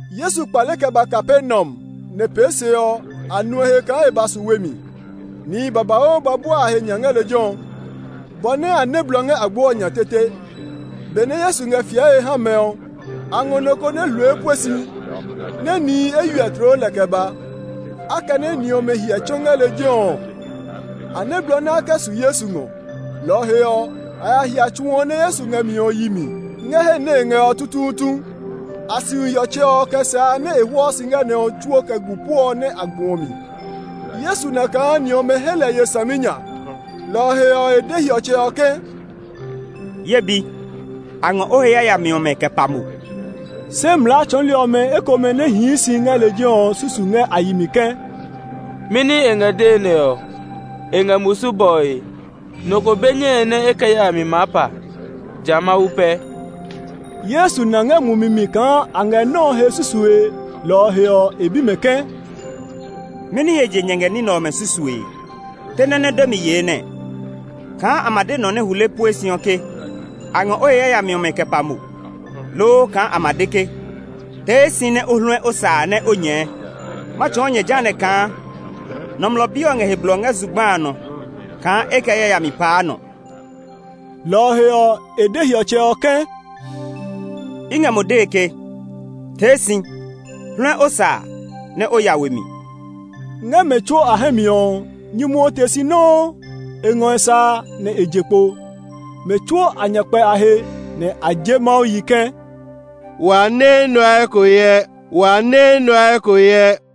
Yesu kpale kɛ ba Kapernaum, nɛ pee se ɔ, a nu e he kaa e ba su we mi. Nihi babauu ba bua a he nya ngɛ lejɛ ɔ bɔ nɛ a nɛ́ blɔ ngɛ agbo ɔ nya tete. Benɛ Yesu ngɛ fiɛe ha mɛ ɔ, a ngɔ nɔ ko nɛ hule pue si, nɛ nihi eywiɛ tloo lɛ kɛ ba. Akɛnɛ ni ɔmɛ hiɛ tsɔ ngɛ lejɛ ɔ, a nɛ́ blɔ nɛ a kɛ su Yesu ngɔ. Lɔ ɔ he ɔ, a ya hia tsu ɔ nɛ Yesu ngɛ mi ɔ yi mi, ngɛ he nɛ e ngɛ ɔ tutuutu. A siu hiɔtsɛ ɔ kɛ sa a nɛ e hwɔɔ si ngɛ nɔ ɔ tsuo kɛ gu puɔ nɛ a gbu ɔ mi. Yesu na kaa ni ɔmɛ he lɛ ye saminya, lɔ ɔ he ɔ, e de hiɔtsɛ ɔ ke, “Ye bi, a ngɔ o he yayami ɔmɛ kɛ pa mo!” Se mlaa tsɔɔli ɔmɛ ekomɛ nɛ hii si ngɛ lejɛ ɔ susu ngɛ a yi mi ke, “Mɛni e ngɛ dee nɛ ɔ? E ngɛ musu bɔe. Nɔ ko be nyɛe nɛ e kɛ yayami maa pa, ja Mawu pɛ.” Yesu na ngɛ mumi mi kaa a ngɛ nɔ́ ɔ he susue, lɔ ɔ he ɔ, e bi mɛ ke, “Mɛni he je nyɛ ngɛ ní nɛ ɔmɛ susue ɔ? Te nɔ́ nɛ demi yee nɛɛ; kaa a ma de nɔ nɛ hule pue si ɔ ke, ‘A ngɔ o he yayami ɔmɛ kɛ pa mo,’ loo kaa a ma de ke, ‘Tee si nɛ o hluɛ o sa a nɛ o nyɛɛ?’ Ma tsɔɔ nyɛ jehanɛ ɔ kaa Nɔmlɔ Bi ɔ ngɛ he blɔ ngɛ zugba a nɔ kaa e kɛ yayami paa nɔ.” Lɔ ɔ he ɔ, e de hiɔtsɛ ɔ ke, “I ngɛ mo dee ke, tee si, hluɛ o sa a nɛ o ya we mi!” Ngɛ mɛ tsuo a hɛ mi ɔ, nyumu ɔ te si nɔuu; e ngɔ e sa a, nɛ e je kpo. Mɛ tsuo a nya kpɛ a he, nɛ a je Mawu yi ke, “Wa nɛ enɛ ɔ eko hyɛ!”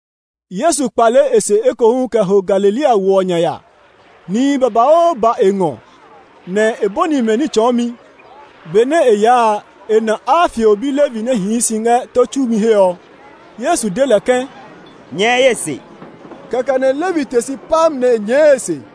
Yesu kpale e se ekohu kɛ ho Galilea wo ɔ nya ya. Nihi babauu ba e ngɔ, nɛ e bɔni mɛ ní tsɔɔmi. Benɛ e yaa a, e na Alfeo bi Levi nɛ hii si ngɛ tó tsumi he ɔ. Yesu de lɛ ke, “Nyɛɛ ye se.” Kɛkɛ nɛ Levi te si pam nɛ e nyɛɛ e se.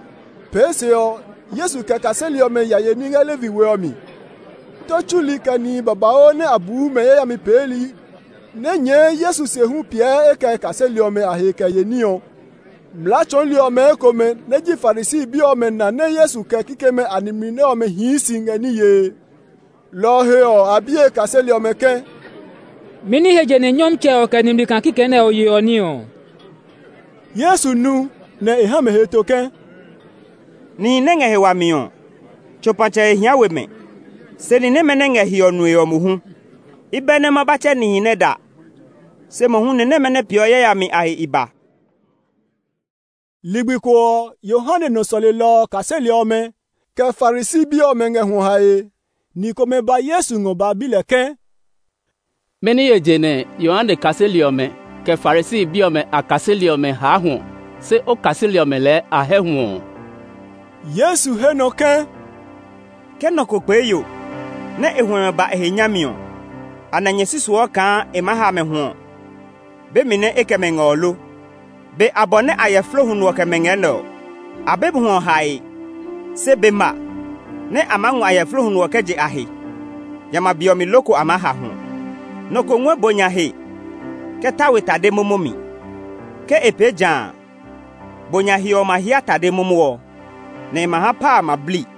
Pee se ɔ, Yesu kɛ e kaseli ɔmɛ ya ye ní ngɛ Levi we ɔ mi. Tó tsuli, kɛ nihi babauu nɛ a buu mɛ yayami peeli nɛ nyɛɛ Yesu se hu piɛ e kɛ kaseli ɔmɛ a he kɛ ye ní ɔ. Mlaa tsɔɔli ɔmɛ ekomɛ nɛ ji Farisi bi ɔmɛ na nɛ Yesu kɛ kikɛmɛ a nimli nɛ ɔmɛ hii si ngɛ ní yee. Lɔ ɔ he ɔ, a bi e kaseli ɔmɛ ke, “Mɛni he je nɛ Nyɔmtsɛ ɔ kɛ nimli kaa kikɛ nɛ ɔ yeɔ ní ɔ?” Yesu nu, nɛ e ha mɛ heto ke, “Nihi nɛ ngɛ he wami ɔ, tsopatsɛ he hia we mɛ, se ni nɛmɛ nɛ ngɛ hiɔ nue ɔ mohu. I bɛ nɛ ma ba tsɛ nihi nɛ da, se mohu ni nɛmɛ nɛ peeɔ yayami a he i ba.” Ligbi ko ɔ, Yohane nɔ sɔlelɔ ɔ kaseli ɔmɛ, kɛ Farisi bi ɔmɛ ngɛ hwɔ hae. Ni komɛ ba Yesu ngɔ ba bi lɛ ke, “Mɛni he je nɛ Yohane kaseli ɔmɛ, kɛ Farisi bi ɔmɛ a kaseli ɔmɛ haa hwɔ, se o kaseli ɔmɛ lɛɛ a hɛ́ hwɔ ɔ?” Yesu he nɔ ke, “Ke nɔ ko kpee yo nɛ e huɛmɛ ba e he nyami ɔ, anɛ nyɛ susuɔ kaa e maa ha mɛ hwɔ be mi nɛ e kɛ mɛ ngɛ ɔ lo? Be abɔ nɛ ayɛflo huno ɔ kɛ mɛ ngɛ nɛ ɔ, a be hwɔ hae. Se be ma nɛ a maa ngɔ ayɛflo huno ɔ kɛ je a he; jamɛ a be ɔ mi loko a maa ha hwɔ. “Nɔ ko ngɔɛ bo nya he kɛ ta we tade momo mi. Ke e pee ja a, bo nya he ɔ ma hía tade momo ɔ, nɛ e ma ha pa a ma blii.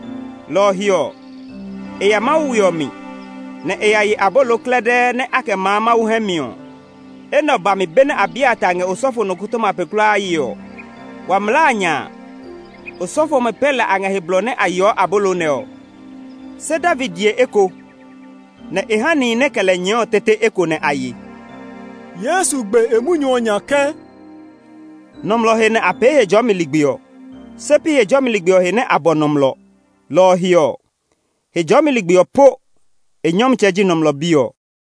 lɔ ɔ he ɔ, e ya Mawu we ɔ mi, nɛ e ya ye abolo klɛdɛɛ nɛ a kɛ maa Mawu hɛ mi ɔ. Enɛ ɔ ba mi benɛ Abiatar ngɛ osɔfo nɔkɔtɔma pe kulaa yee ɔ. Wa mlaa a nya a, osɔfo ɔmɛ pɛ lɛ a ngɛ he blɔ nɛ a yeɔ abolo nɛ ɔ, se David ye eko, nɛ e ha nihi nɛ kɛ lɛ nyɛɛ ɔ tete eko nɛ a ye.” Yesu gbe e munyu ɔ nya ke, “Nɔmlɔ he nɛ a pee Hejɔɔmi ligbi ɔ, se pi Hejɔɔmi ligbi ɔ he nɛ a bɔ nɔmlɔ. Lɔ ɔ he ɔ, Hejɔɔmi ligbi ɔ po e nyɔmtsɛ ji Nɔmlɔ Bi ɔ.”